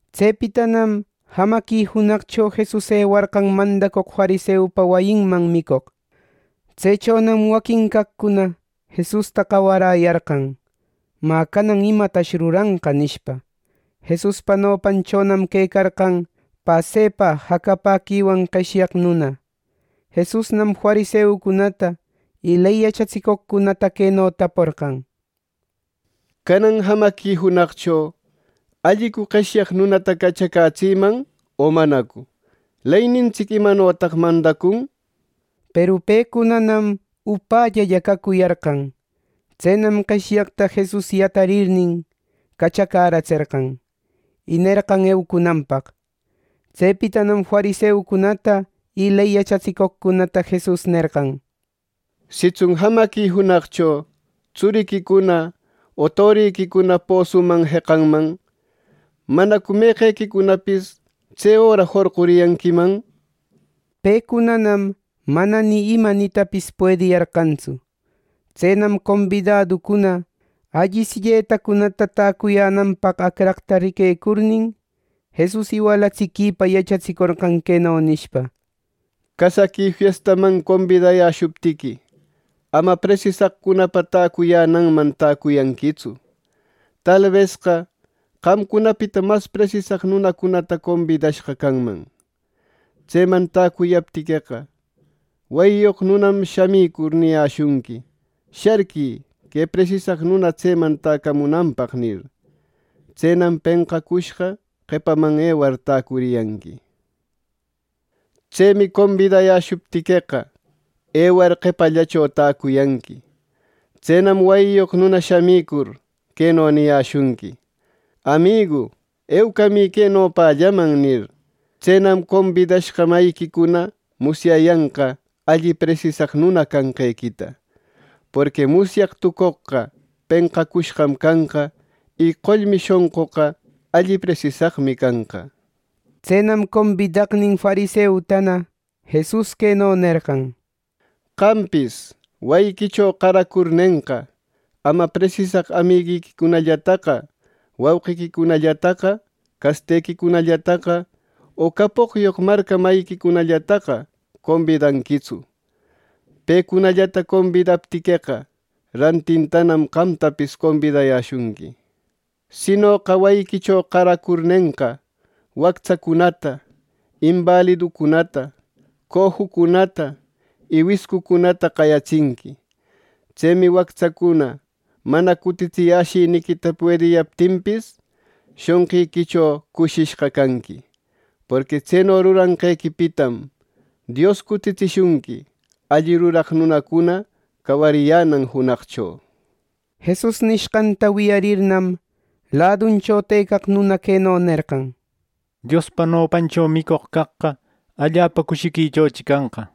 Tsepitanam jamaqui junaqcho Jesus ewarqan mandacoq fariseupa wayinman micoq. Tsechonam waquin caqcunana Jesusta qawaräyarqan, “Mä, canan ¿imatash ruranqa?” nishpa. Jesuspa nopanchonam quecarqan pasepa jacapäquiwan qeshyaq nuna. Jesusnam fariseucunata y ley yachatsicoqcunata queno taporqan: —Canan jamaqui junaqcho, ¿allicu qeshyaq nunata cachacätsïman, o manacu? Leynintsic, ¿imanotaq mandacun? —nishpa. Peru pecunanam upällalla cacuyarqan. Tsenam qeshyaqta Jesus yatarirnin, cachacäratserqan, y nerqan eucunanpaq. Tsepitanam fariseucunata y ley yachatsicoqcunata Jesus nerqan: —Sitsun jamaqui junaqcho tsuriquicuna o toriquicuna posuman jeqayanman, ¿manacu meqequicunapis tse öra jorquriyanquiman? Pecunanam mana ni ima nitapis puediyarqantsu. Tsenam combidaducuna alli silletacunata täcuyänanpaq acraqta riquecurnin, Jesus iwalatsiquipa yachatsicorqan queno nishpa: —Casaqui fiestaman combidayäshuptiqui, ama presisaqcunapa täcuyananman täcuyanquitsu. Talbesqa qamcunapita mas presisaq nunacunata combidashqa canman. Tseman täcuyaptiqueqa, wayiyoq nunam shamicur niyäshunqui, ‘Sharquï, que presisaq nuna tseman täcamunanpaq’ nir. Tsenam penqacushqa qepaman ewar täcuriyanqui. Tsemi combidayäshuptiqueqa, ewar qepallacho täcuyanqui. Tsenam wayiyoq nuna shamicur, queno niyäshunqui: ‘Amigu, eucamï que nopällaman’ nir. Tsenam combidashqa mayiquicuna musyayanqa alli presisaq nuna cayanqequita. Porqui musyaq tucoqqa, penqacushqam canqa; y qollmi shonquqa, alli presisaqmi canqa. Tsenam combidaqnin fariseutana Jesus queno nerqan: —Qampis, wayiquicho qaracurnenqa, ama presisaq amiguiquicunallataqa, wauqiquicunallataqa, castequicunallataqa o capoqyoq marca mayiquicunallataqa combidanquitsu. Pecunallata combidaptiqueqa, rantintanam qamtapis combidayäshunqui. Sinoqa wayiquicho qaracurnenqa, wactsacunata, imbaliducunata, cojucunata y wiscucunata qayatsinqui. Tsemi wactsacuna mana cutitsiyäshiniquita puediyaptinpis shonqiquicho cushishqa canqui. Porqui tseno ruranqequipitam Dios cutitsishunqui alli ruraq nunacuna cawariyänan junaqcho. Jesus nishqanta wiyarirninnam, laduncho tëcaq nuna queno nerqan: —¡Diospa nopancho micoq caqqa allapa cushiquichochi canqa!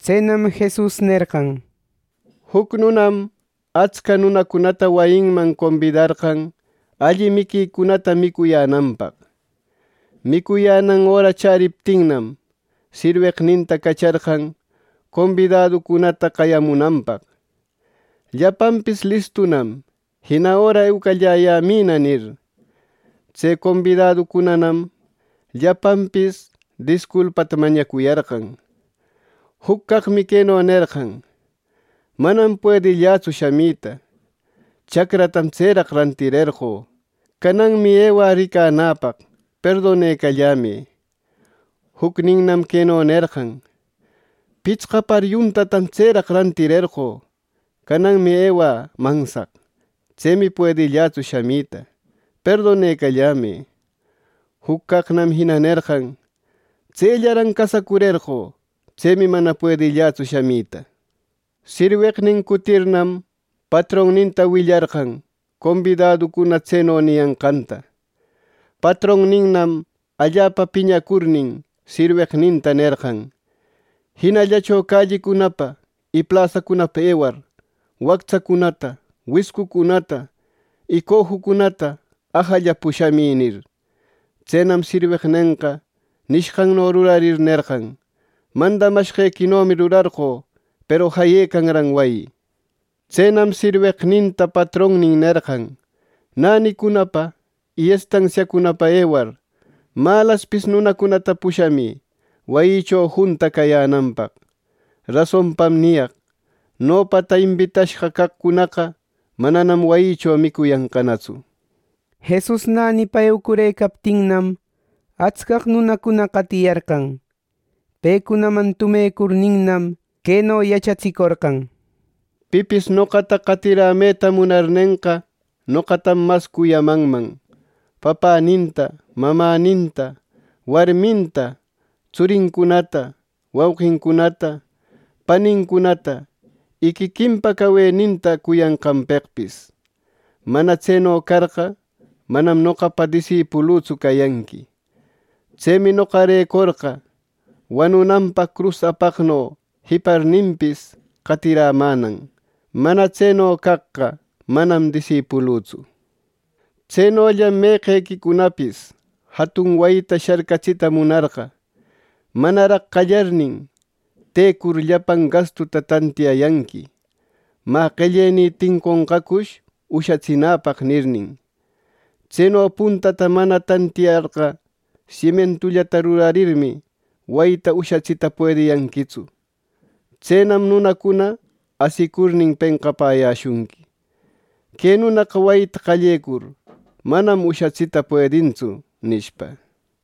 Tsenam Jesus nerqan: —Juc nunam atsca nunacunata wayinman combidarqan alli miquicunata micuyänanpaq. Micuyänan öra chäriptinnam, sirweqninta cacharqan combidaduncunata qayamunanpaq: ‘Llapanpis listunam; jina öra eucalläyämïna’ nir. “Tse combidaducunanam llapanpis disculpata mañacuyarqan. Juc caqmi queno nerqan: ‘Manam puedillätsu shamita. Chacratam tseraq rantirerqö; cananmi ewä ricanäpaq. Perdonecallämë.’ Jucninnam queno nerqan: ‘Pitsqa par yuntatam tseraq rantirerqö; cananmi ewä mansaq. Tsemi puedillätsu shamita. Perdonecallämë.’ Juc caqnam jina nerqan, ‘Tsellaran casacurerqö. Tsemi mana puedillätsu shamita.’ Sirweqnin cutirirnam, patronninta willarqan combidaduncuna tseno niyanqanta. Patronninnam allapa piñacurnin, sirweqninta nerqan, ‘Jinallacho callicunapa y plasacunapa ewar, wactsacunata, wiscucunata y cojucunata ajalla pushamï’ nir. Tsenam sirweqnenqa nishqanno rurarir nerqan, ‘Mandamashqequinomi rurarqö, peru jayëcanran wayi’ Tsenam sirweqninta patronnin nerqan, ‘Nänicunapa y estansiacunapa ewar, malaspis nunacunata pushamï wayïcho junta cayänanpaq.’ Rasonpam niyaq: Nopata imbitashqa caqcunaqa mananam wayïcho micuyanqanatsu.” Jesus nänipa eucurëcaptinnam, atscaq nunacuna qatiyarqan. Pecunaman tumecurninnam, queno yachatsicorqan: —Pipis noqata qatirämeta munarnenqa, noqatam mas cuyamanman papäninta, mamäninta, warminta, tsurincunata, wauqincunata, panincunata y quiquinpa caweninta cuyanqanpeqpis. Mana tseno carqa, manam noqapa disipulütsu cayanqui. Tsemi noqarecorqa, wanunanpaq crus apaqno jiparninpis, qatirämänan. Mana tseno caqqa, manam disipulütsu. Tsenollam meqequicunapis jatun wayita sharcatsita munarqa, manaraq qallarnin, tëcur llapan gastuta tantiyayanqui, ‘Mä, ¿qellenï tinconqacush ushatsinäpaq?’ nirnin. Tseno puntata mana tantiyarqa, simientullata rurarirmi, wayita ushatsita puediyanquitsu. Tsenam nunacuna asicurnin penqapäyäshunqui, ‘¡Que nunaqa wayita qallecur, manam ushatsïta puedintsu!’ nishpa.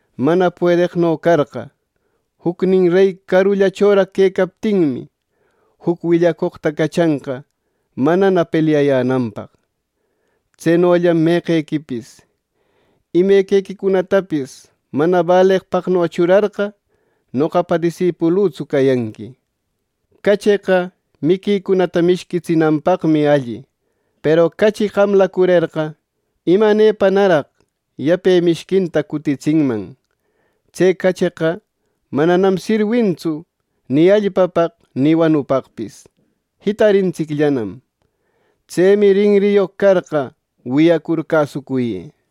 Mana puedeqno carqa, jucnin rey carullachoraq quecaptinmi, juc willacoqta cachanqa manana pelyayänanpaq. Tsenollam meqequipis imequicunatapis mana baleqpaqno churarqa, noqapa disipulütsu cayanqui. “Cacheqa miquicunata mishquitsinanpaqmi alli. Peru cachi qamläcurerqa, ¿imanepanaraq yape mishquinta cutitsinman! Tse cacheqa mananam sirwintsu ni allpapaq, ni wanupaqpis; jitarintsicllanam. ¡Tsemi rinriyoq carqa, wiyacur cäsucuyë!”